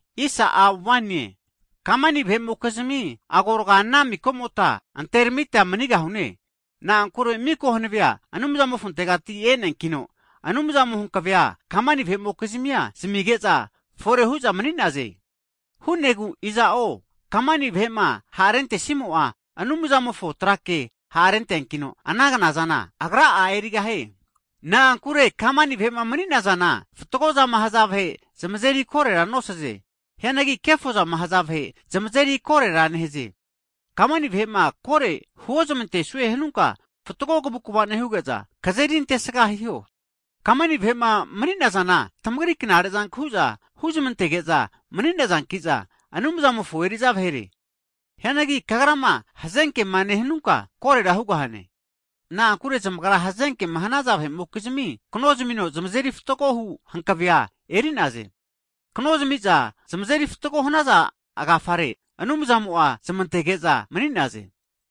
Hagi kamani vahe'mokizmi agorga ana mikomota anteramita manigahune. Na'ankure miko hanavea Anumzamofontegati e'neankino, Anumzamo'ma hankavea kamani vahe'mokizmia zamige'za fore hu'za mani'naze. Hu'negu iza'o kamani vahe'ma ha'rentesimo'a, Anumzamofo trake ha'renteankino, ana knazana agra'a erigahie. Na'ankure kamani vahe'ma mani'nazana, fatgo zama haza vahe zamazeri korera nosaze. Hianagi kefozama haza vahe zamazeri korera nehaze. Kamani vahe'ma kore huozmantesue hanunka, fatgo kavukva nehuge'za, kazeri antesga hiho. Kamani vahe'ma mani'nazana tamagri knare zanku huzmantege'za mani'nazanki'za, Anumzamofo eri'za vahere. Hianagi kagrama hazenkema nehanunka, korera hugahane. Na'ankure zamagra hazenkema hanaza vahe'mokizmi, knomazamino zamazeri fatgohu hankavea eri'naze, kano zamiza zamazeri fatgo hanaza agafare, Anumzamo'a zmantege'za mani'naze.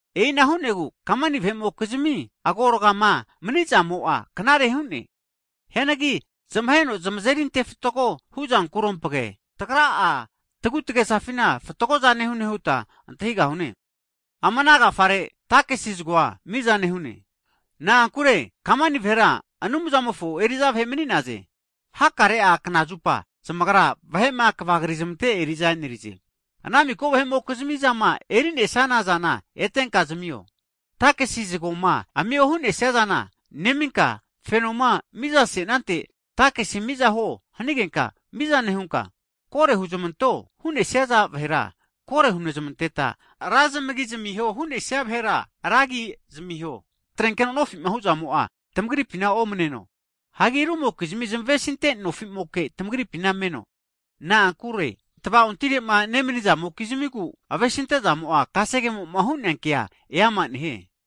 E'ina hu'negu kamani vahe'mokizmi zmagorgama mani'zamo'a knare hu'ne. Hianagi zmaheno zamazeri ante fatgo huzankukerompage, tagra'a tagu'tagesafina fatgo'za nehune huta antahigahune. Ama ana agafare takisi zagoa miza nehune. Na'ankure kamani vahera Anumzamofo eri'za vahe mani'naze. Hakare'a knazupa zamagra vahe'ma kvagrizmante eri'za enerize. Hagi ana miko vahe'mokizmi zama eri'nesaza zana eteta zamiho, takisi zagoma zamiho hunesizana neminka, fenoma mizasenante takesi zago miza hiho hanageta miza nehuta, kore huzmanteho hu'nesaza vahera, kore hunezmanteta, ra zamagi zamiho hu'nesia vahera, ra zamagi zamiho. Atrenkeno nofima hu'zamo'a tamagripina omaneno, hagi rumokizmi zamavesinte nofimoke tamagripina meno. Na'ankure tva'ontamirema nemanizamokizmigu avesintezamo'a, kasegemoma hu'nea ke amage ante fatgo nehie.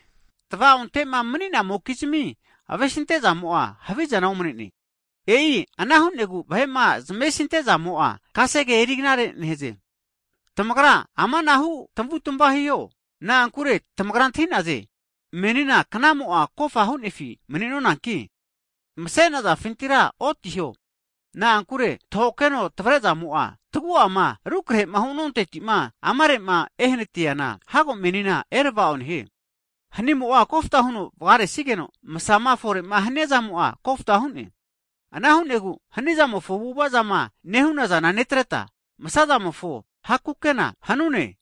Tava'onte'ma mani'namokizmi avesintezamo'a havizana omnene. E'i ana hu'negu vahe'ma zamesinte'zamo'a kasege eri knare nehie. Tamagra ama anahu tamavutamava hiho, na'ankure tamagra antahinaze, menina knamo'a kofa hu'nefi mani'nonanki, masenazafintira otiho. Na'ankure tahokeno tavrezamo'a, tagu'ama rukrehema hunontetima amare'ma ehanatiana, hago menina erava'o nehie. Hanizamo'a kofta huno vagaresigeno, masama fore'ma hania zamo'a kofta hu'ne. Ana hu'negu hanizamofo avu'ava zama nehu'na zana netreta, masamofo ha' kukena hanune. Ana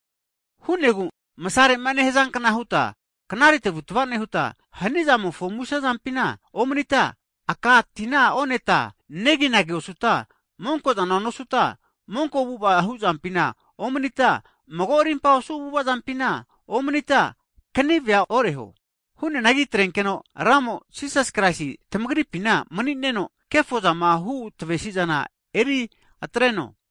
hu'negu masare'ma nehazankna huta knare tavutava nehuta, hanizamofo muse zampina omanita, aka tina oneta neginagi osuta, monko'zana nosuta, monko avu'ava hu'zampina omanita, mago rimpa osu avu'ava zampinena omanita kanive oreho. Hu'neanagi atrenkeno, Ramo, Jisas Kraisi tamagripina mani'neno, kefozama hu tamavesizana eri atreno.